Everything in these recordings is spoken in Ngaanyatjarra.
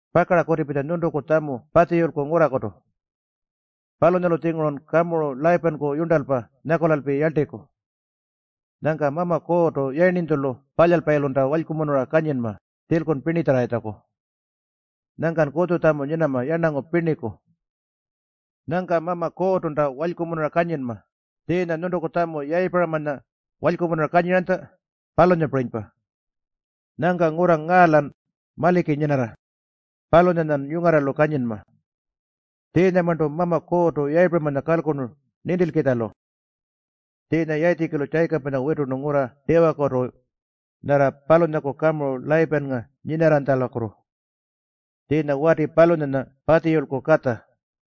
Pakara kutipitja nyuntuku tjamu Patjiyulku ngurrakutu. Palunyalu-tjingurun kamuru Layipanku yurntalpa nyakulalpi yarltiku. Nyangka Mama Kuurrtu Yayirninytjulu Palyalpayilunta walykumunura kanyinma tjilkun pirnitjarrarritjaku. Nyangkan kutjutjamu nyinama yarnangu pirniku. Nyangka Mama Kuurrtunta walykumunura kanyinma, tjiinya nyuntuku tjamu Yayipuramanya walykumunura kanyiranytja, palunyapirinypa. Nyangka ngurra ngaa-lan maliki nyinarra, palunyanyan yungarralu kanyinma. Tjiinyamarntu Mama Kuurrtu Yayipuramanya kalkurnu nintilkitjalu.” Tjiinya Yayitjikilu Tjayikapanya witurnu ngurra tiwakutu, nyarra palunyaku kamuru Layipannga nyinarranytjalakutu. Tjiinya wati palunyanya Patjiyulku katja.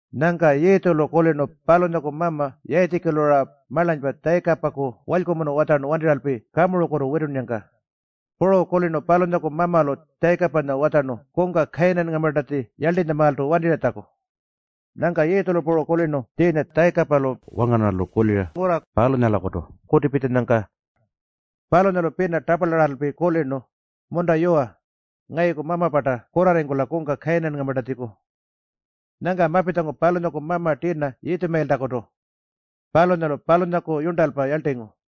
Nyangka Yiitjulu kulirnu palunyaku mama Yayitjikilu-ra marlanypa Tjayikapaku walykumunu watjarnu wantirralpi kamurukutu witunnyangka. Puru kulirnu palunyaku mamalu Tjayikapanya watjarnu kungka Kayinanngamartatji yarltinytjamaaltu wantirratjaku. Nyangka Yiitjulu puru kulirnu tjiinya Tjayikapalu wangarnarralu kulira ngurra palunyalakutu kutipitjanyangka. Palunyalu pina taparlarraralpi kulirnu, “Munta yuwa, ngayuku mama-parta kurrarringkula kungka Kayinanngamartatjiku.” Nyangka mapitjangu palunyaku mama tirna Yitjumayiltakutu. Palunyalu palunyaku yurntalpa yarltingu.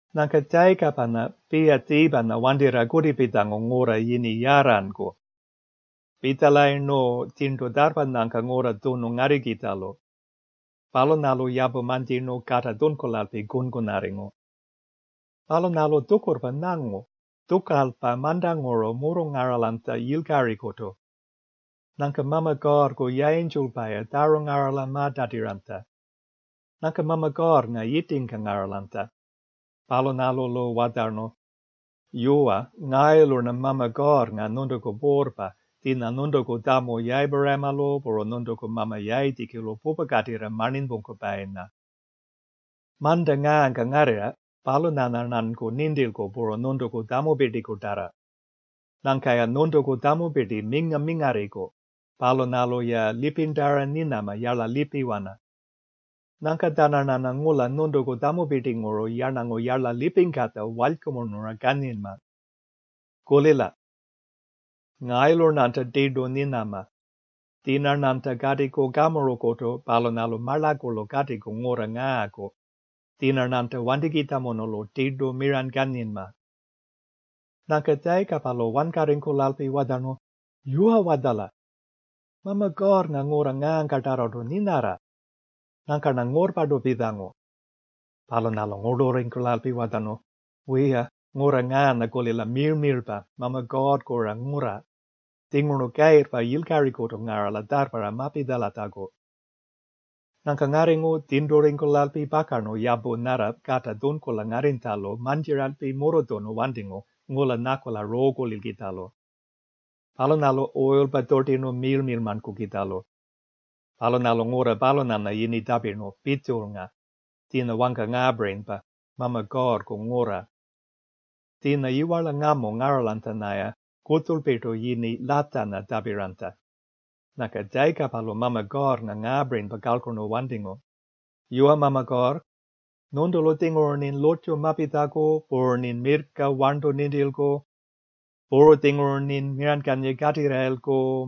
Nyangka Tjayikapanya Piyatjiipanya wantirra kutipitjangu ngurra yini Yarranku. Pitjalayirnu tjirntu tjarrpanyangka ngurra tjunu ngarrikitjalu. Palunyalu yapu mantjirnu kata tjunkulalpi kunkunarringu. Palunyalu tjukurrpa nyangu tjukalpa mantanguru murrungaralanytja yilkarikutu. Nyangka Mama Kuurrku yayintjulpa-ya tjarungarala ma-tatiranytja. Nyangka Mama Kuurrnga yitingka ngaralanytja. Palunyalu-lu watjarnu, “Yuwa, ngayulu-rna Mama Kuurrnga nyuntuku Puurrpa, tjiinya nyuntuku tjamu Yayipuramalu puru nyuntuku mama Yayitjikilu pupakatirra marninypungkupayinya. Manta ngaangkan ngarrirra, palunyanya-rnanku nintilku puru nyuntuku tjamupirtikutarra. Nyangka-ya nyuntuku tjamupirti minga-mingarriku. Palunyalu-ya lipirntara nyinama yarla lipiwana. Nyangka-tjananyarna ngula nyuntuku tjamupirtinguru yarnangu yarla lipingkatja walykumunura kanyinma. Kulila. Ngayulu-rnanta tirtu nyinama. Tjiinya-rnanta katiku kamurukutu palunyalu marlakulu katiku ngurra ngaaku. Tjiinya-rnanta wantikitjamunulu tirtu miranykanyinma.” Nyangka Tjayikapalu wankarringkulalpi watjarnu, “Yuwa-watjala? Mama Kuurrnga ngurra ngaangkatarrartu nyinarra. Nyangka-rna ngurrpartu pitjangu.” Palunyalu ngurlurringkulalpi watjarnu, “Wiya, ngurra ngaanya-kulila miirl-miirlpa. Mama Kuurrku-ra ngurra. Tjinguru kayirrpa yilkarikutu ngarala tjarrparra mapitjalatjaku.” Nyangka ngarringu tjirnturringkulalpi pakarnu yapu nyarra kata tjunkula ngarrinytjalu mantjiralpi murrutjunu wantingu ngula nyakula ruukulilkitjalu. Palunyalu uyilpa tjutirnu miirl-miirlmankukitjalu. Palunyalu ngurra palunyanya yini tjapirnu Pitjulnga, tjiinya wangka ngaapirinypa, Mama Kuurrku Ngurra. Tjiinya yiwarla ngamu ngaralanytjanya-ya kutjulpirtu yini Latjanya tjapiranytja. Nyangka Tjayikapalu Mama Kuurrnga ngaapirinypa kalkurnu wantingu, “Yuwa Mama Kuurr, nyuntulu-tjinguru-rnin lurrtju mapitjaku, puru-rnin mirrka, warntu nintilku. Puru-tjinguru-rnin miranykanyira katirrayilku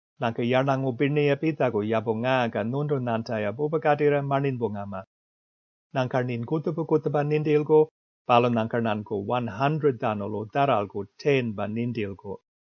Nyangka yarnangu pirninya-ya pitjaku yapu ngaangka nyuntunyanta-ya pupakatirra marninypungama. Nyangka-rnin kutjupa-kutjupa nintilku, palunyangka-rnanku 100-tjanulu tjarralku 10-pa nintilku.”